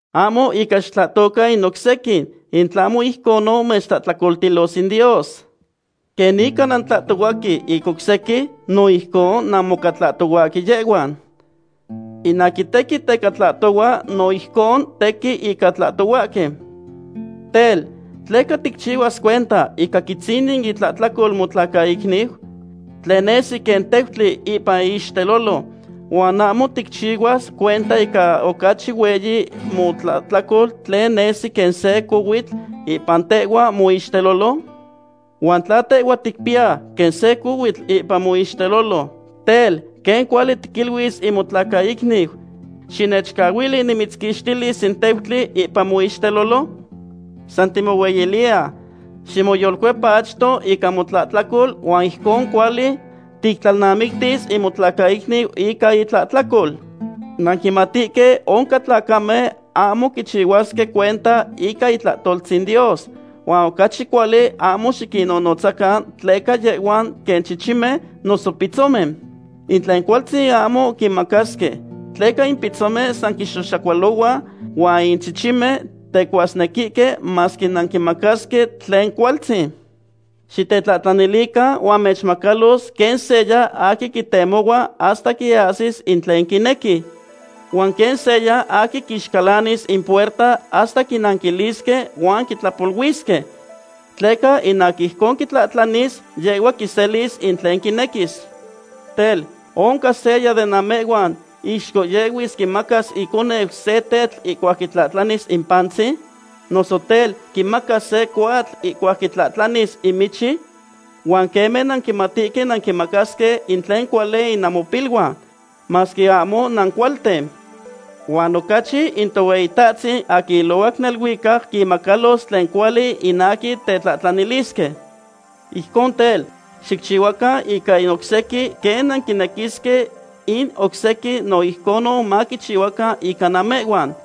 ’Ahmo ica xitlahtocan in oc sequin, in tlahmo ijconon mechtlahtlacoltilos in Dios. Quen ica nantlahtohuahque in oc sequin, no ijcon namoca tlahtohuahque yehhuan. In aquin tequin teca tlahtohua, no ijcon tequin ica tlahtohuahque. Tel, ¿tleca ticchihuas cuenta ica quitzinin itlahtlacol motlacaicniu, tlen nesi quen teutli ipan iixtelolo, huan ahmo ticchihuas cuenta ica ocachi hueyi motlahtlacol tlen nesi quen se cohuitl ipan tehhua moixtelolo? Huan tla tehhua ticpiya quen se cohuitl ipan moixtelolo, tel, ¿quen cuali tiquiluis in motlacaicniu: “Xinechcahuili nimitzquixtilis in teutli ipan moixtelolo”? San timohueyiliya. Ximoyolcuepa achto ica motlahtlacol huan ijcon cuali tictlalnamictis in motlacaicniu ica itlahtlacol. ’Nanquimatihque oncan tlacamen ahmo quichihuasque cuenta ica itlahtoltzin Dios, huan ocachi cuali ahmo xiquinnonotzacan tleca yehhuan quen chichimen noso pitzomen. In tlen cualtzin ahmo quinmacasque, tleca in pitzomen san quixoxacualohua huan in chichimen tecuasnequihque masque nanquimacasque tlen cualtzin. ’Xitetlahtlanilican huan mechmacalos quen seya aquin quitemohua hasta quiahsis in tlen quinequi, huan quen seya aquin quixcalanis in puerta hasta quinanquilisque huan quitlapoluisque. Tleca in aquin ijcon quitlahtlanis, yehhua quiselis in tlen quinequis. ’Tel, ¿oncan seya de namehhuan ixcohyehui quimacas in iconeu se tetl ihcuac quitlahtlanis in pantzin? Noso tel, ¿quimacas se cohuatl ihcuac quitlahtlanilis in michi? Huan queme nanquimatihque quen nanquinmacasque in tlen cuali in namopiluan, masque ahmo nancualten. Huan ocachi in Tohueyitahtzin aquin ilohuac neluicac quinmacalos tlen cuali in aquin tetlahtlanilisque. ’Ijcon tel, xicchihuacan ica in oc sequin quen nanquinequisque in oc sequin no ijcon maquichihuacan ica namehhuan.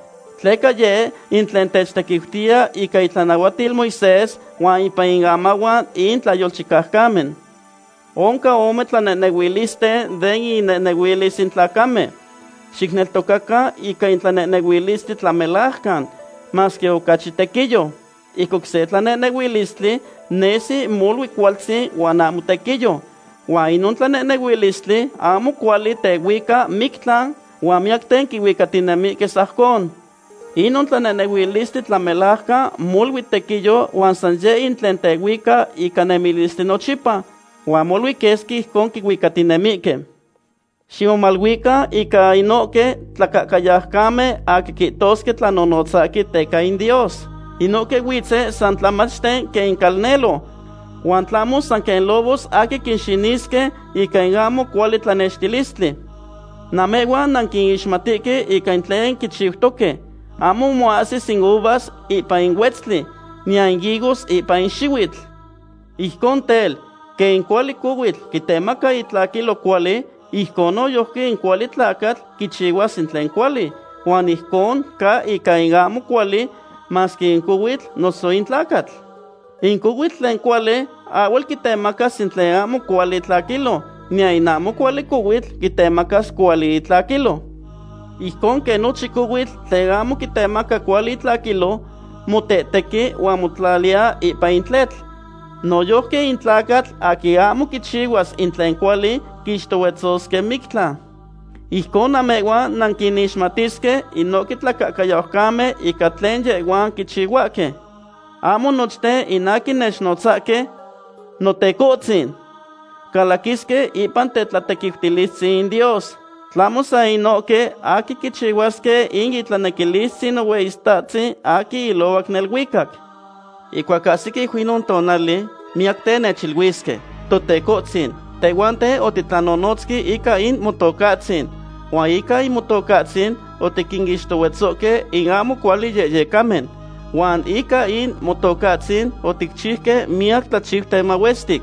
Tleca yeh in tlen techtequiutiya ica itlanahuatil Moisés huan ipan in amahuan in tlayolchicaucamen. ’Oncan ome tlanehnehuilisten den innemilis in tlacamen. Xicneltocacan ica in tlanehnehuilistli tlamelajcan, masque ocachi tequiyo. In oc se tlanehnehuilistli nesi molui cualtzin huan ahmo tequiyo. Huan inon tlanehnehuilistli ahmo cuali tehuica mictlan huan miyacten quihuicatinemihque sajcon. Inon tlanehnehuilistli tlamelajcan molui tequiyo huan san yeh in tlen tehuica ica nemilistli nochipa, huan molui quesqui ijcon quihuicatinemihque. ’Ximomaluican ica inohque tlacahcayaucamen aquin quihtosque tlanonotzahque teca in Dios. Inohque huitzen san tlamachten quen in calnelo, huan tlahmo san quen lobos aquin quinxinisque ica in ahmo cuali tlanextilistli. Namehhuan nanquinixmatihque ica tlen quichiutoque. Ahmo moahsis in uvas ipan in huetztli, niyan in higos ipan in xihuitl. Ijcon tel, quen in cuali cohuitl quitemaca itlaquilyo cuali, ijcon noyojqui in cuali tlacatl quichihuas in tlen cuali. Huan ijconon ca ica in ahmo cuali, masque in cohuitl noso in tlacatl. In cohuitl tlen cuali ahhuel quitemacas in tlen ahmo cuali itlaquilyo, niyan in ahmo cuali cohuitl quitemacas cuali itlaquilyo. Ijcon quen nochin cohuitl tlen ahmo quitemaca cuali itlaquilyo motehtequi huan motlatiya ipan in tletl, noyojqui in tlacatl aquin ahmo quichihuas in tlen cuali quixtohuetzosque mictlan. Ijcon, namehhuan nanquinixmatisque inohque tlacahcayaucamen ica tlen yehhuan quichihuahque. ’Ahmo nochten in aquin nechnotzahque: “Notecohtzin”, calaquisque ipan tetlatequiutilistzin in Dios. Tlahmo san inohque aquin quichihuasque in itlanequilistzin Nohueyitahtzin aquin ilohuac neluicac. Ihcuac ahsiquiu inon tonali, miyacten nechiluisque: “Totecohtzin, tehhuanten otitlanonotzque ica in Motocahtzin, huan ica in Motocahtzin otiquinixtohuetzohque in ahmo cuali yehyecamen, huan ica in Motocahtzin oticchiuque miyac tlachiuten mahuestic.”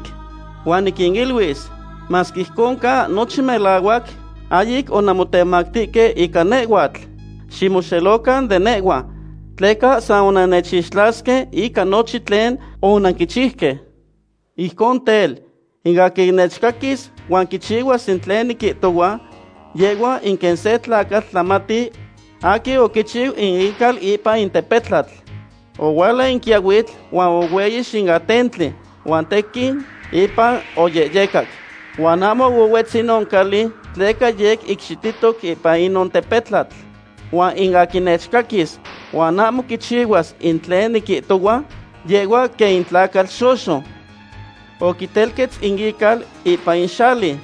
Huan niquiniluis: “Masque ijcon ca nochin melahuac, ahyic onanmotemactihque ica nehhuatl. Ximoxelocan de nehhua, tleca san onannechixtlasque ica nochin tlen onanquichiuque.” ’Ijcon tel, in aquin nechcaquis huan quichihuas in tlen niquihtohua, yehhua in quen se tlacatl tlamati aquin oquichihchiu in ical ipan in tepetlatl. Ohuala in quiyahuitl, huan ohueyix in atentli, huan tequin ipan oyehyecac, huan ahmo ohuetz inon cali tleca yec icxitihtoc ipan inon tepetlatl. Huan in aquin nechcaquis huan ahmo quichihuas in tlen niquihtohua, yehhua quen in tlacatl xoxo. Oquitelquetz in ical ipan in xali.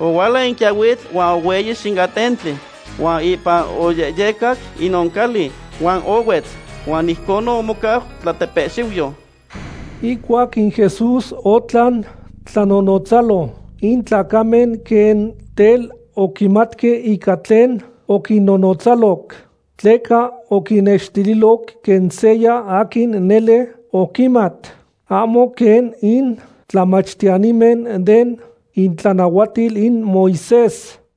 Ohuala in quiyahuitl huan ohueyix in atentli, huan ipan oyehyecac inon cali, huan ohuetz, huan ijcon omocau tlatepehxiuyo. Ihcuac in Jesús otlan tlanonotzalo, in tlacamen quen tel oquimatque ica tlen oquinnonotzaloc. Tleca oquinnextililoc quen seya aquin nele oquimat, ahmo quen in tlamachtiyanimen den itlanahuatil in Moisés.